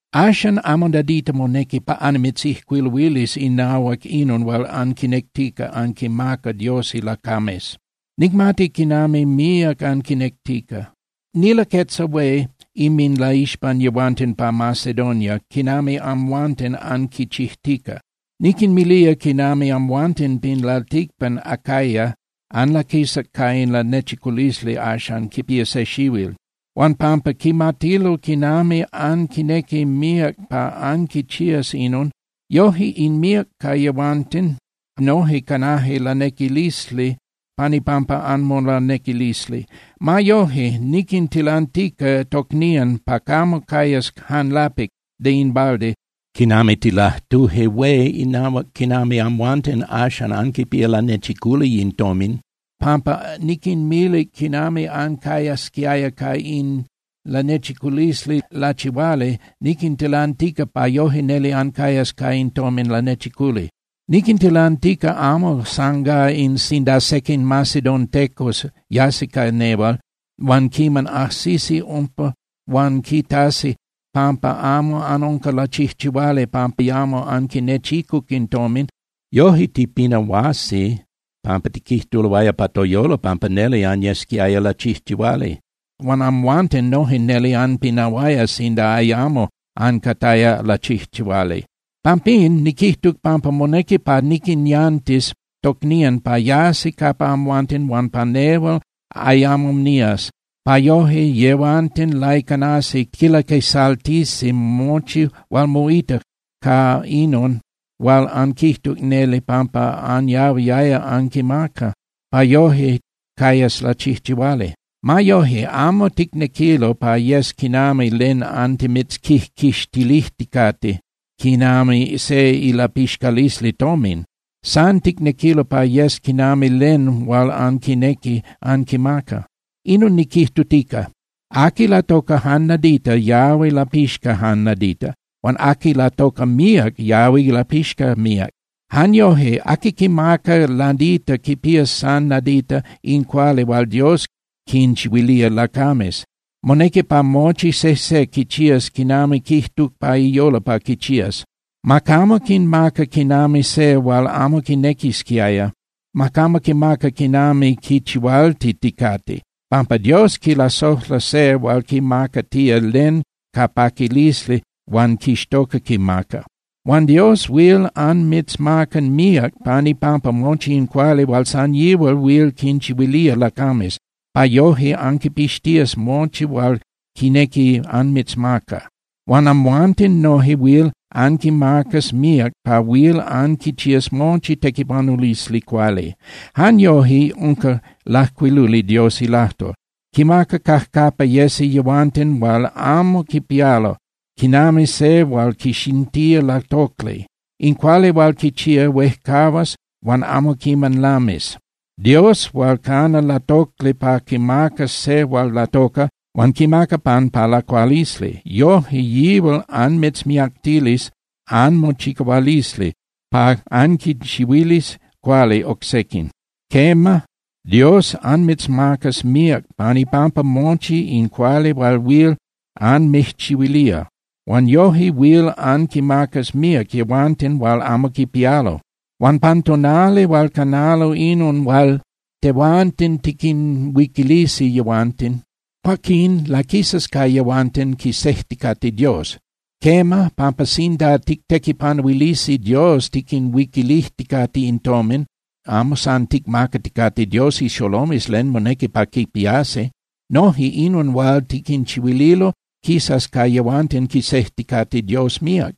Axan amo nadita monequi pa annimitzijcuiluilis inahuac inon hual anquinectica anquinmaca Dios ilacames. Nicmati quinami míac anquinectica. Nilaquetza hué inminlaixpan yehuanten pa Macedonia quinami amhuanten anquichijtica. Niquinmilía quinami amhuanten pin lalticpan Acaya anlaquisac ca in lanechiculisli axan quipía se xihuil. Huan pampa quimatilo quinami anquinequi míac pa anquichías inon, yoje in míac ca yehuanten noje canaje lanequilisli pan ipampa anmolanequilisli. Ma yoje, niquintilantica tocnían pa camo cayas jan lapic (de in balde) quinami tilajtuje hué inahuac quinami amhuanten axan anquipía lanechiculi in tomin. Pampa niquinmilic quinami ancayasquiaya ca in lanechiculisli lachihuali, niquintilantica pa yoje neli ancayas ca in tomin lanechiculi. Niquintilantica amo san gá in sinda sequin macedontecos yasi ca nehual, huan quiman ajsisi umpa huan quitasi pampa amo anunca lachijchihuali pampa ayamo anquinechicuc in tomin, yoje tipinahuasi pampa tiquijtuloaya pa toyolo pampa neli anyesquiaya lachijchihuali. Huan amhuanten noje neli anpinahuaya sinda ayamo ancataya lachijchihuali. Pampín, niquijtuc pampa monequi pa niquinyantis tocnían pa yasi capa amhuanten huan pa nehual ayamo nías, pa yoje yehuanten laicanasi quilaquisaltisi mochi hual moita ca inon hual anquijtuc neli pampa anyahuiaya anquimaca, pa yoje cayas lachijchihuali. Ma yoje, amo ticnequilo pa yes quinami len antimitzquijquixtilijticate quinami se ilapixcalisli tomin. San ticnequilo pa yes quinami len hual anquinequi anquimaca. Inon niquijtutica: Aqui latoca jan nadita yahui lapixca jan nadita. Huan aqui latoca míac yahui lapixca míac. Jan yoje aqui quimaca nadita quipías san nadita in cuali hual Dios quinchihuilía lacames. Monequi pa mochi sejse quichías quinami quijtuc pa iyolo pa quichías. Ma camo quimaca quinami se hual amo quinequisquiaya, ma camo quimaca quinami quichihualtiticate, pampa Dios quilasojla se hual quimacatía len ca paquilisli huan quixtoca quimaca. Huan Dios huil anmitzmaca míac pan ipampa mochi in cuali hual san yihual huil quinchihuilía lacames, pa yoje anquipixtías mochi hual quinequi anmitzmaca. Huan amhuanten noje huil anquimacas míac pa huil anquichías mochi tequipanulisli cuali. Jan yoje unca lajcuiluli Dios ilajtol: Quinmaca cajcapa yesi yehuanten hual amo quipialo, quinami se hual quixintía latocli. In cuali hual quichía huejcahuas huan amo quiman lamis. Dios hual cana latocli pa quimacas se hual latoca huan quimaca pan pa lacualisli, yoje yihual anmitzmiactilis anmochicahualisli pa anquinchihuilis cuali oc sequin. Quema, Dios anmitzmacas míac pan ipampa mochi in cuali hual huil anmijchihuilía. Huan yoje huil anquinmacas míac yehuanten hual amo quipialo. Huan pan tonali hual canalo inon hual tehuanten tiquinhuiquilisi yehuanten, cuaquín laquisas ca yehuanten quisejticate Dios. Quema, pampa sinda tictequipanuilisi Dios tiquinhuiquilijticate in tomin, amo san ticmacaticate Dios ixolomes len monequi pa quipiasi. Noje inon hual tiquinchihuililo quisas ca yehuanten quisejticate Dios míac.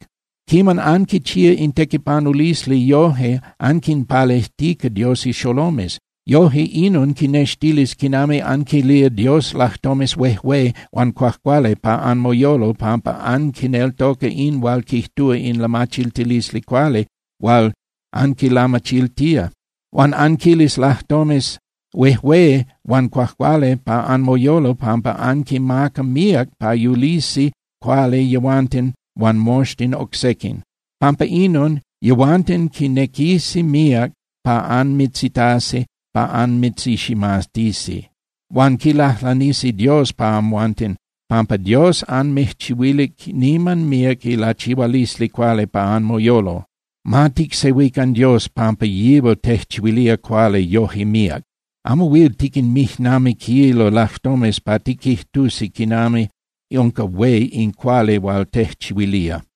Quiman anquichía in tequipanulisli yoje anquinpalejtica Dios ixolomes. Yoje inon quinextilis quinami anquilía Dios lajtomes huejué huan cuajcuali pa anmoyolo pampa anquineltoca in hual quijtúa in lamachiltilisli cuali hual anquilamachiltía. Huan anquilis lajtomes huejué huan cuajcuali pa anmoyolo pampa anquimaca míac pa yulisi cuali yehuanten huan moxtin oc sequin. Pampa inon, yehuanten quinequisi míac pa anmitzitasi pa anmitziximatisi. Huan quilajlanisi Dios pa amhuanten, pampa Dios anmijchihuilic niman míac ilachihualisli cuali pa anmoyolo. ¡Ma ticsehuican Dios pampa yihual tejchihuilía cuali yoje míac! ¡Amo huil tiquinmijnamiquilo lajtomes pa tiquijtusi quinami unca hué in cuali hual tejchihuilía!